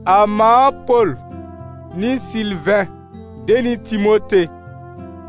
A mãa Pol, nɩ Sɩlvɛ̃ de nɩ Timote,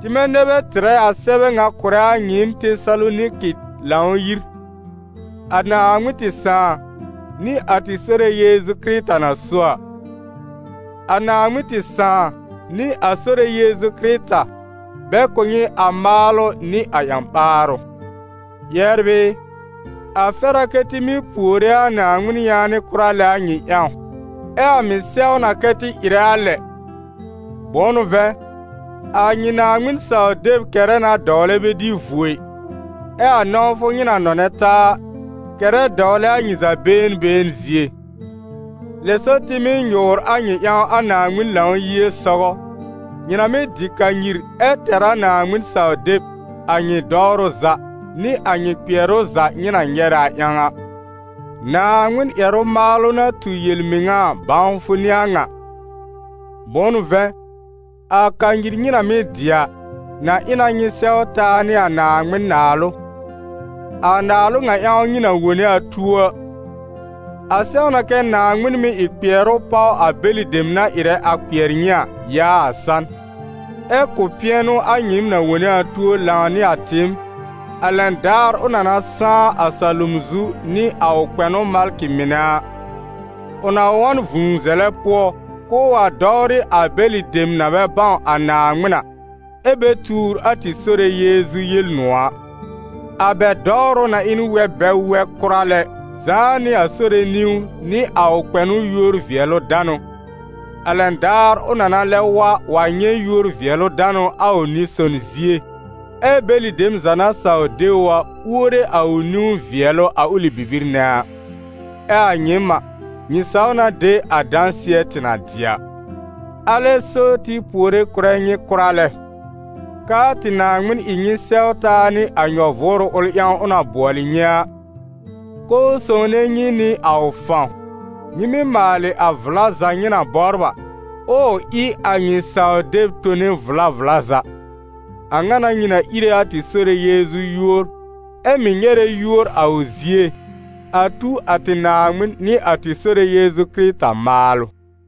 tɩmɛ nɛ bɛ tɩrɛ a sɛbɛ ŋa kʋ̀rɛ a nyɩɩm Tesaloniki Lãw-yir, a Naaŋmɩn tɩ Sãà nɩ a tɩ Sore Yeezu Kɩrɩta na so a. A Naaŋmɩn tɩ Sãà nɩ a Sore Yeezu Kɩrɩta, bɛ kʋ̀ nyɩ a maalʋ nɩ a ƴã-ɓaarʋ. Yɛbr ɩ, a fɛr a kɛ́ tɩ mɩ́ puore a Naaŋmɩn yaanɩ kʋra lɛ a nyɩ ƴãw. Ɛ a mɩ̀ sɛw na kɛ́ tɩ ɩrɛ a lɛ, bʋ̃ʋ n'ʋ vɛ̃, a nyɩ Naaŋmɩn-saw-deb kɛrɛ na dɔwlɛ bɛ dɩ vuo ɩ, ɛ a nɔ̃wfʋ nyɩ na nɔnɛ taa a, kɛrɛ dɔwlɛ a nyɩ za been been zie. Lɛ so, tɩ mɩ́ nyʋ̀ʋr a nyɩ ƴãw a Naaŋmɩn Lãw-yie sɔgɔ, nyɩ na mɩ́ dɩ kanyir ɛ tɛr a Naaŋmɩn-saw-deb, a nyɩ dɔwrʋ za, nɩ a nyɩ kpɩɛrʋ za nyɩ na nyɛrɛ a ƴãw a. Naaŋmɩn ƴɛrʋ maalʋ na tu yel-mɩŋa a bãwfʋ n'ɩ a ŋa, bʋ̃ʋ n'ʋ vɛ̃, a kanyir nyɩ na mɩ́ dɩ a, na ɩ na nyɩ sɛw taa nɩ a Naaŋmɩn Naalʋ, a Naalʋ ŋa ƴãw nyɩ na wone a tuo a. A sɛw na kɛ́ Naaŋmɩn mɩ́ ɩ kpɩɛrʋ páw a bɛlɩ dem na ɩrɛ a kpɩɛr nyɩ a, yaa a san, ɛ́ kʋ̀ pɩɛnʋ a nyɩɩm na wone a tuo lãw nɩ a tɩɩm, a lɛn daar ʋ na na sãá a salom zu nɩ a ʋ kpɛnʋ malkɩ mɩnɛ a; ʋ na wa n vũu zɛlɛ pʋɔ, k'ʋʋ wa dɔwrɩ a bɛlɩ dem na bɛ bãw a Naaŋmɩn a, ɛ́ bɛ tuur a tɩ Sore Yeezu Yel-nʋ̃ɔ̀ a. A bɛ dɔwrʋ na ɩ n wɛb bɛ wɛ kʋra lɛ, zãá nɩ a Sore niwn nɩ a ʋ kpɛnʋ yúor-vɩɛlʋ-danʋ, a lɛn daar ʋ na na lɛb wa wa nyɛ̃ yúor-vɩɛlʋ-danʋ a ʋ nɩ-son zie, ɛ bɛlɩ dem za na saw de ʋ a, uore a ʋ niwn vɩɛlʋ a ʋlɩ bibir nɛ a; ɛ a nyɩɩm a, nyɩ saw na de a dãsɩɛ tɩ na dɩ a. Alɛ so tɩ puore kʋ̀rɛ nyɩ kʋra lɛ, k'aa tɩ Naaŋmɩn ɩ nyɩ sɛw taa nɩ a nyɔ-vʋʋrʋ ʋl ƴãw ʋ na bʋɔlɩ nyɩ a, k'ʋʋ sõwne nyɩ nɩ a ʋ fãw, nyɩ mɩ́ maalɩ a vla za nyɩ na bɔbr a, ʋʋ ɩ a nyɩ saw-deb tone vla vla za. A ŋa n'a nyɩ na íre a tɩ Sore Yeezu yúor, ɛ mɩ̀ nyɛrɛ yúor a ʋ zie, a tu a tɩ Naaŋmɩn nɩ a tɩ Sore Yeezu Kɩrɩta maalʋ.